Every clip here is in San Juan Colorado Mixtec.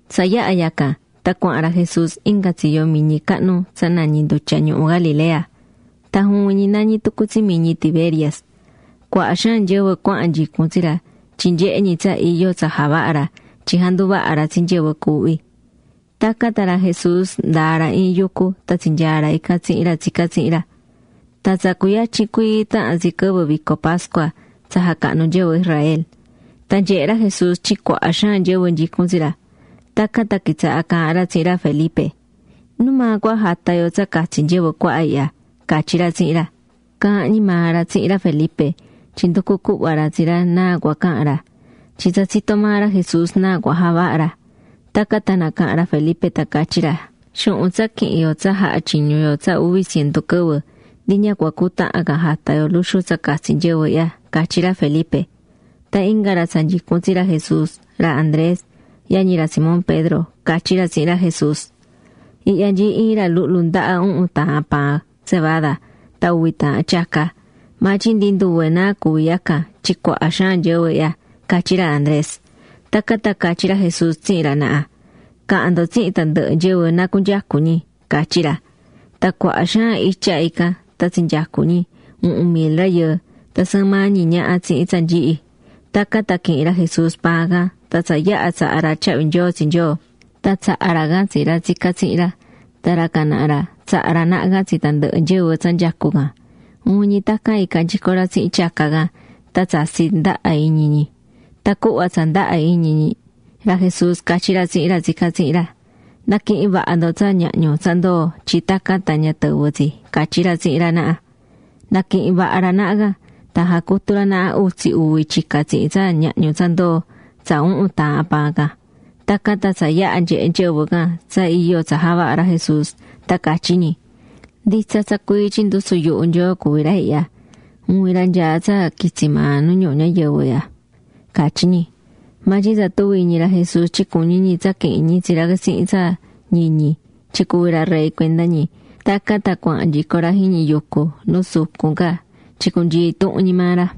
Tsa yaha̱ yacan, tan cuahán ra Jesús inga tsiyo miñi cahnu tsa nañí Ndutya Ñuhu Galilea. Tan juvin ñi nañí tucu tsi Miñi Tiberias. Cuaha xaan nyɨvɨ cuahán nyicun tsi ra tyin nyehé ñi tsa iyo tsa javahá ra tyin janduvahá ra tsi nyɨvɨ cuuhví. Tacan tan ra Jesús ndaa̱ ra iin yucu tan tsinyaa̱ ra ican tsihin ra tsicá tsihin ra. Tan tsa cuyatyin cuii tahan tsi quɨvɨ vico pascua tsa jacahnú nyɨvɨ Israel. Tan nyehe̱ ra Jesús tyin cuaha xaan nyɨvɨ nyicún tsi ra, tacan tan quitsaha̱ caahán ra tsihin ra Felipe: ―¿Numaa cua jata yo tsa catsi nyɨvɨ cuaha ihya? ―catyí ra tsihin ra. Caahán ñi maa ra tsihin ra Felipe tyin nducú cuhva ra tsi ra náa cua cahan ra, tyin tsa tsitó maa ra Jesús náa cua javaha ra. Tacan tan nacaha̱n ra Felipe tan catyi̱ ra: ―Xuhun tsa quihin yo tsa jaha̱ tyiñu yo tsa uvi cientu quɨvɨ, ndi ña cua cutahan can jata yo luxu tsa catsi nyɨvɨ ihya ―catyí ra Felipe. Tan inga ra tsa nyicún tsi ra Jesús, ra Andrés, yañi ra Simón Pedro, catyí ra tsihin ra Jesús: ―Ihya nyií iin ra luhlu ndaha uhun taahan paan cebada tan uvi taahan tyaca. Maa tyin ndi nduve náa cuví yacan tyin cuaha xaan nyɨvɨ ihya ―catyí ra Andrés. Tacan tan catyí ra Jesús tsihin ra naha: ―Ca̱han ndo tsihin tandɨhɨ nyɨvɨ na cunyecu ñi ―catyí ra. Tan cuaha xaan itya ican tan tsinyecu̱ ñi, uhun mil rayɨɨ, [tan sɨɨn maa ñi ñaha tsihin tsa nyihi]. Tacan tan quihi̱n ra Jesús paan can tan tsa yaha̱ tsaha̱ ra tyahvi nyoo tsi Nyoo, tan tsaha̱ ra can tsi ra tsicá tsihin ra. Tan ra can naha ra, tsaha̱ ra naha can tsi tandɨhɨ nyɨvɨ tsa nyecú can. Juvin ñi tacan ica̱ nyico ra tsihin tyaca can. Tan tsatsi̱ ndaha iñi ñi. Tan cuhva tsa ndaha iñi ñi, ra Jesús catyí ra tsihin ra tsicá tsihin ra: ―Na̱quihin vaha ndo tsa ñahñu tsa ndoo̱ tyin tacan tan ña tɨvɨ tsi ―catyí ra tsihin ra naha. Naquihi̱n vaha ra naha can, tan jacutu̱ ra naha utsi uvi tyica tsihin tsa ñahñu tsa ndoo̱ tsa uhun taahan paan can. Tacan tan tsa yaha̱ nyehe̱ nyɨvɨ can tsa iyo tsa javaha̱ ra Jesús, tan catyí ñi: ―Nditsa tsa cuii tyin ndusu yuhu Nyoo cuví ra ihya, juvin ra nyaá tsa quitsi maa nu ñuhu ñayɨvɨ ihya ―catyí ñi. Maa tyin tsa tuvi̱ iñi ra Jesús tyin cuñí ñi tsa quihin ñi tsi ra tsihin tsa ñiñi tyin cuvi ra rey cuenda ñi, tacan tan cuahán nyico ra jiñi yucu nu sucun ca tyin cunyii intuhun ñi maa ra.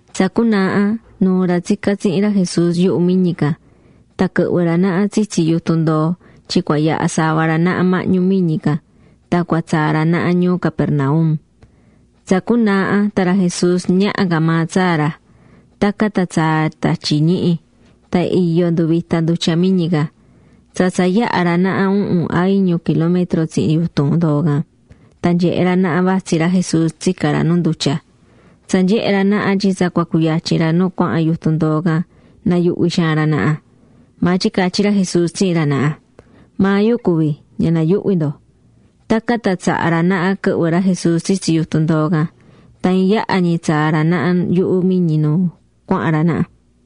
Tsa cunaaha, nuu̱ ra tsicá tsihin ra Jesús yuhu miñi can. Tan quɨhvɨ̱ ra naha tsitsi yutun ndoo tyin cua yaha sava ra naha mahñu miñi can tan cua tsaa ra naha ñuu Capernaum. Tsa cunaaha tan ra Jesús ñaha ca maa tsaa ra. Tacan tan tsaa̱ tatyi ñihi. Tan iyo nduvita̱ ndutya miñi can. Tsa tsa yaha̱ ra naha uhun a iñu kilómetro tsihin yutun ndoo can tan nyehe̱ ra naha vatsí ra Jesús tsicá ra nu ndutya. Tsa nyehe̱ ra naha tyin tsa cua cuyatyin ra nu cuahán yutun ndoo can, nayuhvi̱ xaan ra naha. Maa tyin catyí ra Jesús tsihin ra naha: ―¡Maa yu cuví, ña na̱yuhvi ndo! Tacan tan tsaha̱ ra naha quɨhvɨ ra Jesús tsitsi yutun ndoo can. Tan iin yaha ñi tsaa̱ ra naha yuhu miñi nu cuahán ra naha.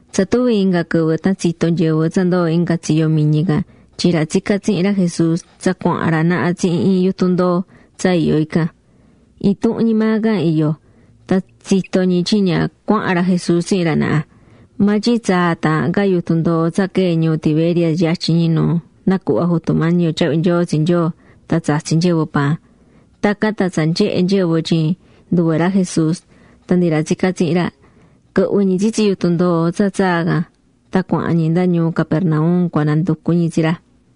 Tsa tuvi inga quɨvɨ tan tsito̱ nyɨvɨ tsa ndoo̱ inga tsiyo miñi can tyin ra tsicá tsihin ra Jesús tsa cuahán ra naha tsihin iin yutun ndoo tsa iyó ican. Intuhun ñi maa can iyó. Tan tsito̱ ñi tyin ña cuahán ra Jesús tsihin ra naha. Maa tyin tsaa̱ taahan ca yutun ndoo tsa quee̱ ñuu Tiberias yatyin ñi nu nacuhva̱ Jutu Mañi yo tyahvi nyoo tsi Nyoo tan tsatsi̱ nyɨvɨ paan. Tacan tan tsa nyehe̱ nyɨvɨ tyin nduve ra Jesús tan ndi ra tsicá tsihin ra, quɨhvɨ̱ ñi tsitsi yutun ndoo tsa tsaa̱ tan cuahán ñi nda ñuu Capernaum cua nanducu ñi tsi ra.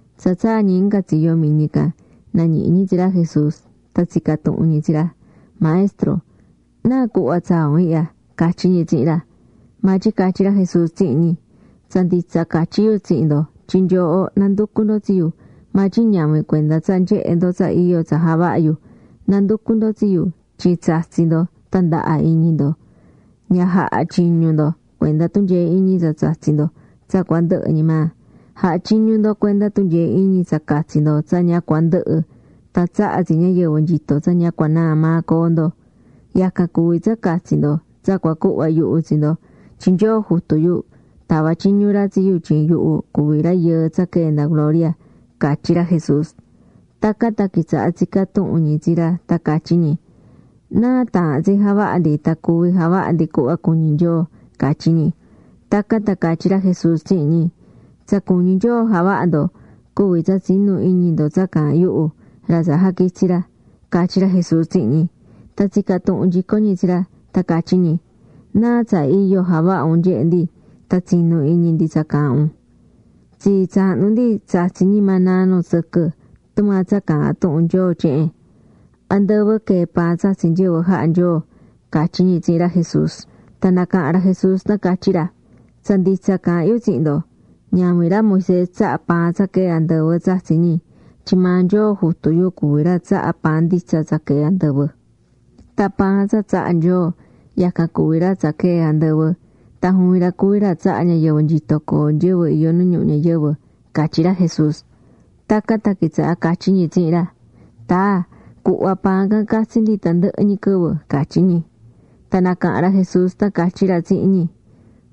Tsa tsaa̱ ñi inga tsiyo miñi can, nañihi̱ ñi tsi ra Jesús. Tan tsica̱ tuhun ñi tsi ra: ―Maestro, ¿náa cuhva tsaa̱ un ihya? ―catyí ñi tsihin ra. Maa tyin catyí ra Jesús tsihin ñi: ―Tsa nditsa catyí yu tsihin ndo tyin nyooho nanducú ndo tsi yu maa tyin ñavin cuenda tsa nyehe̱ ndo tsa iyo tsa javaha̱ yu. Nanducú ndo tsi yu tyin tsatsi̱ ndo tan ndaha iñi ndo. Ña ja̱ha tyiñu ndo cuenda tunyee iñi tsa tsatsí ndo tsa cua ndɨhɨ ñi maa, ja̱ha tyiñu ndo cuenda tunyee iñi tsa catsi ndo tsa ña cua ndɨhɨ tan tsahá tsi ñayɨvɨ nyito tsa ña cua naa maa coo ndo. Yacan cuví tsa catsi ndo tsa cua cuhva yuhu tsi ndo tyin Nyoo Jutu yu tava̱ tyiñu ra tsi yu tyin yuhu cuví Rayɨɨ tsa quee̱ nda gloria ―catyí ra Jesús. Tacan tan quitsaha̱ tsicá tuhun ñi tsi ra tan catyí ñi: ―¿Náa taahán tsi javaha ndi tan cuví javaha ndi cuhva cuñí Nyoo? ―catyí ñi. Tacan tan catyí ra Jesús tsihin ñi: ―Tsa cuñí Nyoo javaha ndo, cuví tsa tsi̱nu iñi ndo tsa caahán yuhu, ra tsa jaquitsi̱ ra ―catyí ra Jesús tsihin ñi. Tan tsica̱ tuhun nyico ñi tsi ra, tan catyí ñi: ―¿Náa tsa iyo javaha un nyehe ndi tan tsinu iñi ndi tsa caahán un? Tsii tsahnu ndi tsatsi̱ ñi maná nu tsɨquɨ, tumaa tsa caahán tuhun Nyoo tyehen: “Andɨvɨ quee̱ paan tsatsi̱ nyɨvɨ jaha̱ Nyoo” ―catyí ñi tsihin ra Jesús. Tan nacaha̱n ra Jesús tan catyí ra: ―Tsa nditsa caahán yu tsihin ndo. Ñavin ra Moisés tsaha̱ paan tsa quee̱ andɨvɨ tsatsi̱ ñi, tyin maa Nyoo Jutu yu cuví ra tsahá paan nditsa tsa quee̱ andɨvɨ. Tyin paan tsa tsahá Nyoo, yacan cuví ra tsa quee̱ andɨvɨ. Tan juvin ra cuví ra tsahá ñayɨvɨ nyito coo nyɨvɨ iyó nu ñuhu ñayɨvɨ ―catyí ra Jesús. Tacan tan quitsaha̱ catyí ñi tsihin ra: ―Taa, cu̱hva paan can catsi ndi tandɨhɨ ñi quɨvɨ ―catyí ñi. Tan nacaha̱n ra Jesús tan catyí ra tsihin ñi: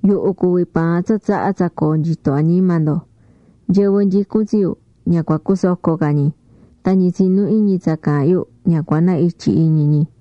―Yuhu cuví paan tsa tsahá tsa coo nyito añima ndo. Nyɨvɨ nyicún tsi yu ña cua cusoco ca ñi, tan ñi tsinú iñi tsa caahán yu ña cua na ityi iñi ñi.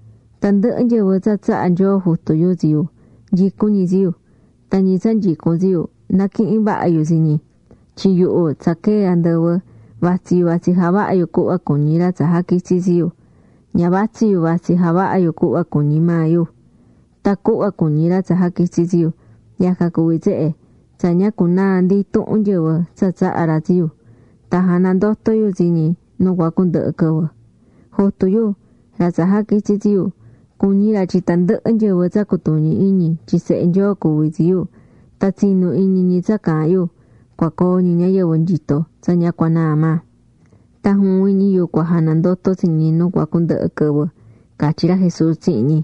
Tandɨhɨ nyɨvɨ tsa tsaha̱ Nyoo Jutu yu tsi yu, nyicún ñi tsi yu, tan ñi tsa nyicún tsi yu, naquihín vaha yu tsi ñi. Tyin yuhu tsa quee̱ andɨvɨ; vatsí yu vatsí javahá yu cuhva cuñí ra tsa jaquitsi̱ tsi yu. Ña vatsí yu vatsí javaha yu cuhva cuñí ñi maa yu. Tan cuhva cuñí ra tsa jaquitsi̱ tsi yu, yacan cuví tsehe: tsa ña cunaa ndi intuhun nyɨvɨ tsa tsahá ra tsi yu, tan janandoto yu tsi ñi nu cua cundɨhɨ quɨvɨ. Jutu yu, ra tsa jaquitsi̱ tsi yu, cuñí ra tyin tandɨhɨ nyɨvɨ tsa cutuñi iñi tyin Sehe Nyoo cuví tsi yu, tan tsinu iñi ñi tsa caahán yu, cua coo ñi ñayɨvɨ nyito tsa ña cua naa maa. Tan juvin ñi yu cua janandoto tsi ñi nu cua cundɨhɨ quɨvɨ ―catyí ra Jesús tsihin ñi.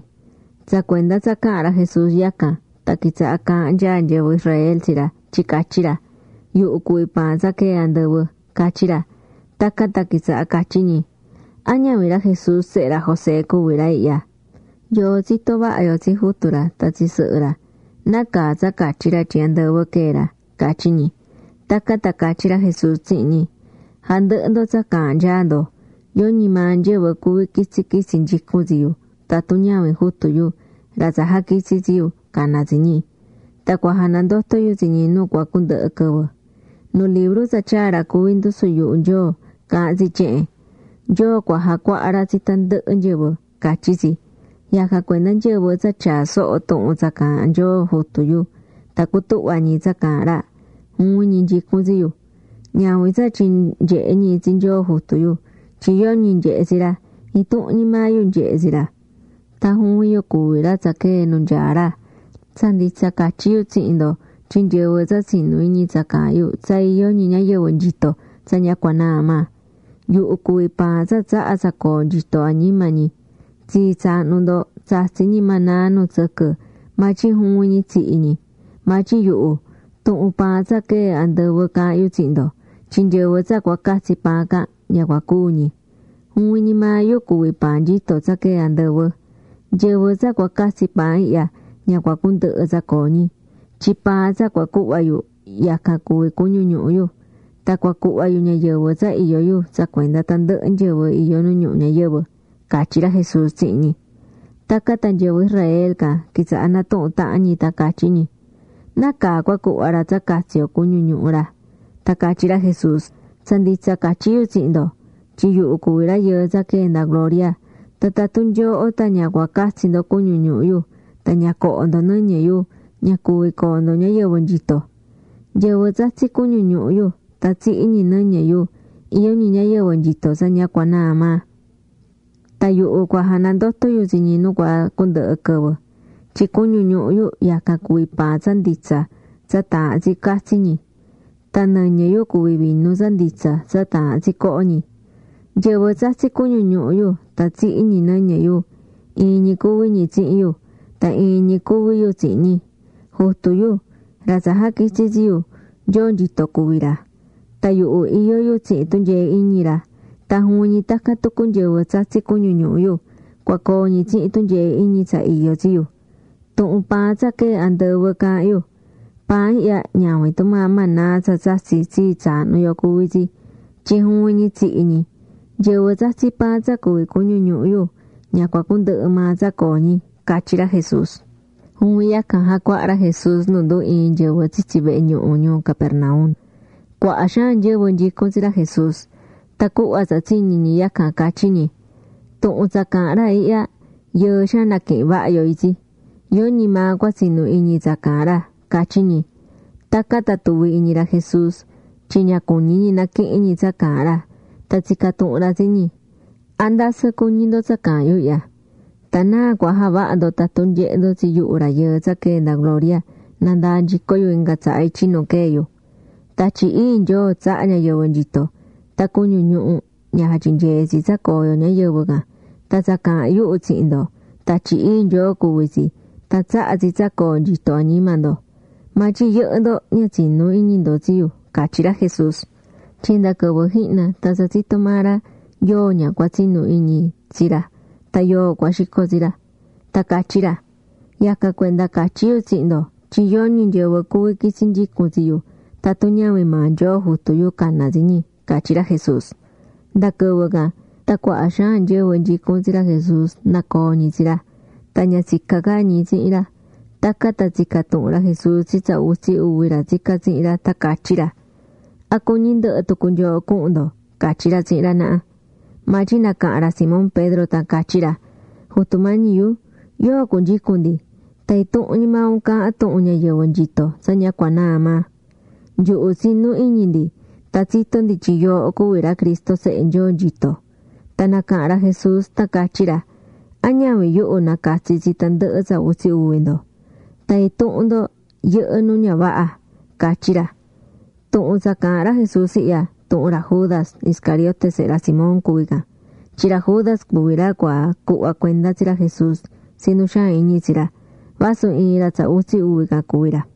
Tsa cuenda tsa caha̱n ra Jesús yacan, tan quitsaha̱ caahán nyaa nyɨvɨ Israel tsi ra tyin catyí ra: “Yuhu cuví paan tsa quee̱ andɨvɨ”, catyí ra. Tacan tan quitsaha̱ catyí ñi: ―¿A ñavin ra Jesús sehe ra José cuví ra ihya? Yoo tsitó vaha yo tsi jutu ra tan tsi sɨhɨ ra. ¿Nacaa tsa catyí ra tyin andɨvɨ quee̱ ra? ―catyí ñi. Tacan tan catyí ra Jesús tsihin ñi: ―Ja̱ndɨhɨ ndo tsa caahán nyaa ndo. Yoñi maa nyɨvɨ cuví quitsi quitsi nyicún tsi yu tatun ñavin Jutu yu, ra tsa jaquitsi̱ tsi yu, caná tsi ñi. Tan cua janandoto yu tsi ñi nu cua cundɨhɨ quɨvɨ. Nu libru tsa tyaa̱ ra cuví ndusu yuhu Nyoo caahán tsi tyehen: “Nyoo cua jacuaha ra tsi tandɨhɨ nyɨvɨ” catyí tsi. Yacan cuenda nyɨvɨ tsa tyaá soho tuhun tsa caahán Nyoo Jutu yu tan cutuhvá ñi tsa caahán ra, juvin ñi nyicún tsi yu. ’Ñavin tsa tyin nyehe̱ ñi tsi Nyoo Jutu yu, tyin yoñi nyehe̱ tsi ra. Intuhun ñi maa yu nyehé tsi ra. Tan juvin yu cuví ra tsa quee̱ nu nyaá ra. Tsa nditsa catyí yu tsihin ndo tyin nyɨvɨ tsa tsinú iñi tsa caahán yu tsa iyó ñi ñayɨvɨ nyito tsa ña cua naa maa. Yuhu cuví paan tsa tsahá tsa coo nyito añima ñi. Tsii tsaahnu ndo tsatsi̱ ñi maná nu tsɨquɨ, maa tyin juvin ñi tsihi̱ ñi. Maa tyin yuhu, tuhun paan tsa quee̱ andɨvɨ caahán yu tsihin ndo, tyin nyɨvɨ tsa cua catsi paan can, ña cua cúu ñi. Juvin ñi maa yu cuví paan nyito tsa quee̱ andɨvɨ. Nyɨvɨ tsa cua catsi paan ihya ña cua cundɨhɨ tsa coo ñi, tyin paan tsa cua cuhva yu, yacan cuví cuñu ñuhu yu. Tan cua cuhva yu ñayɨvɨ tsa iyó yu tsa cuenda tandɨhɨ nyɨvɨ iyó nu ñuhu ñayɨvɨ ―catyí ra Jesús tsihin ñi. Tacan tan nyɨvɨ Israel can quitsaha̱ natuhún tahan ñi tan catyí ñi: ―¿Nacaa cua cuhva ra tsa catsi yo cuñu ñuhu ra? Tan catyí ra Jesús: ―Tsa nditsa catyí yu tsihin ndo, tyin yuhu cuví Rayɨɨ tsa quee̱ nda gloria, tan tatun nyooho tan ña cua catsi ndo cuñu ñuhu yu, tan ña coho ndo nɨñɨ yu, ña cuvi coo ndo ñayɨvɨ nyitó. Nyɨvɨ tsatsí cuñu ñuhu yu tan tsihí ñi nɨñɨ yu, iyó ñi ñayɨvɨ nyito tsa ña cua naa maa. Tan yuhu cua janandoto yu tsi ñi nu cua cundɨhɨ quɨvɨ. Tyin cuñu ñuhu yu yacan cuví paan tsa nditsa tsa taahán tsi catsi ñi, tan nɨñɨ yu cuví vinu tsa nditsa tsa taahán tsi coho ñi. Nyɨvɨ tsatsí cuñu ñuhu yu tan tsihí ñi nɨñɨ yu, iin ñi cuví ñi tsihin yu. Tan iin ñi cuví yu tsihin ñi. Jutu yu, ra tsa jaquitsi̱ tsi yu, Nyoo nyito cuví ra. Tan yuhu iyó yu tsihin tunyee iñi ra. Tan juvin ñi tacan tucu nyɨvɨ tsatsí cuñu ñuhu yu, cua coo ñi tsihin tunyee iñi tsa iyó tsi yu. Tuhun paan tsa quee̱ andɨvɨ caahán yu. Paan ihya ñavin tumaa maná tsa tsatsi̱ tsii tsaahnu yo cuví tsi, tyin juvin ñi tsihi̱ ñi. Nyɨvɨ tsatsí paan tsa cuví cuñu ñuhu yu, ña cua cundɨhɨ maa tsa coo ñi ―catyí ra Jesús. Juvin yacan jacuaha̱ ra Jesús nu ndu ii̱n nyɨvɨ tsitsi vehe ñuhu ñuu Capernaum. Cuaha xaan nyɨvɨ nyicún tsi ra Jesús. Tan cuhva tsa tsiñi̱ ñi yacan catyí ñi: ―Tuhun tsa caahán ra ihya, yɨɨ xaan naquihin vaha yo itsi. Yoñi maa cua tsinu iñi tsa caahán ra ―catyí ñi. Tacan tan tuvi̱ iñi ra Jesús tyin ña cuñí ñi naquihin ñi tsa caahán ra. Tan tsica̱ tuhun ra tsi ñi: ―¿A ndasɨ cuñí ndo tsa caahán yu ihya? Tan ¿náa cua javaha ndo tatun nyehe ndo tsi yuhu Rayɨɨ tsa quee̱ nda gloria nandaa nyico yu inga tsaha ityi nu quee̱ yu? Tatyi Ii Nyoo tsahá ñayɨvɨ nyito. Tan cuñu ñuhu, ña jatyinyeé tsi tsa coo yo ñayɨvɨ can. Tan tsa caahán yuhu tsihin ndo, Tatyi Ii Nyoo cuví tsi tan tsahá tsi tsa coo nyitó añima ndo. Maa tyin yɨhɨ́ ndo ña tsinú iñi ndo tsi yu ―catyí ra Jesús. Tyin nda quɨvɨ jihna tan tsa tsitó maa ra yóo ña cua tsinú iñi tsi ra tan yóo cua xico tsi ra. Tan catyí ra: ―Yacan cuenda catyí yu tsihin ndo tyin yoñi nyɨvɨ cuví quitsi nyicun tsi yu tatun ñavin maa Nyoo Jutu yu caná tsi ñi ―catyí ra Jesús. Nda quɨvɨ can, tan cuaha xaan nyɨvɨ nyicún tsi ra Jesús nacoo̱ ñi tsi ra. Tan ña tsicá ca ñi tsihin ra. Tacan tan tsica̱ tuhun ra Jesús tsi tsa utsi uvi ra tsicá tsihin ra, tan catyí ra: ―¿A cuñí ndɨhɨ tucu nyooho cuhun ndo? ―catyí ra tsihin ra naha. Maa tyin nacaha̱n ra Simón Pedro tan catyí ra: ―Jutu Mañi yu, ¿yóo cunyicun ndi? Tan intuhun ñi maa un caahán tuhun ñayɨvɨ nyito tsa ña cua naa maa. Nyuhu tsinú iñi ndi, tan tsitó ndi tyin yooho cuví ra Cristo Sehe Nyoo nyito. Tan nacaha̱n ra Jesús tan catyí ra: ―¿A ñavin yuhu nacatsi̱ tsi tandɨhɨ tsa utsi uvi ndo? Tan intuhun ndo yɨhɨ́ nu ña vaha ―catyí ra. Tuhun tsa caahán ra Jesús ihya, tuhun ra Judas Iscariote sehe ra Simón cuví can. Tyin ra Judas cuví ra cua cuhva cuenda tsi ra Jesús tsi nu xaan iñi tsi ra, vasu iin ra tsa utsi uvi can cuví ra.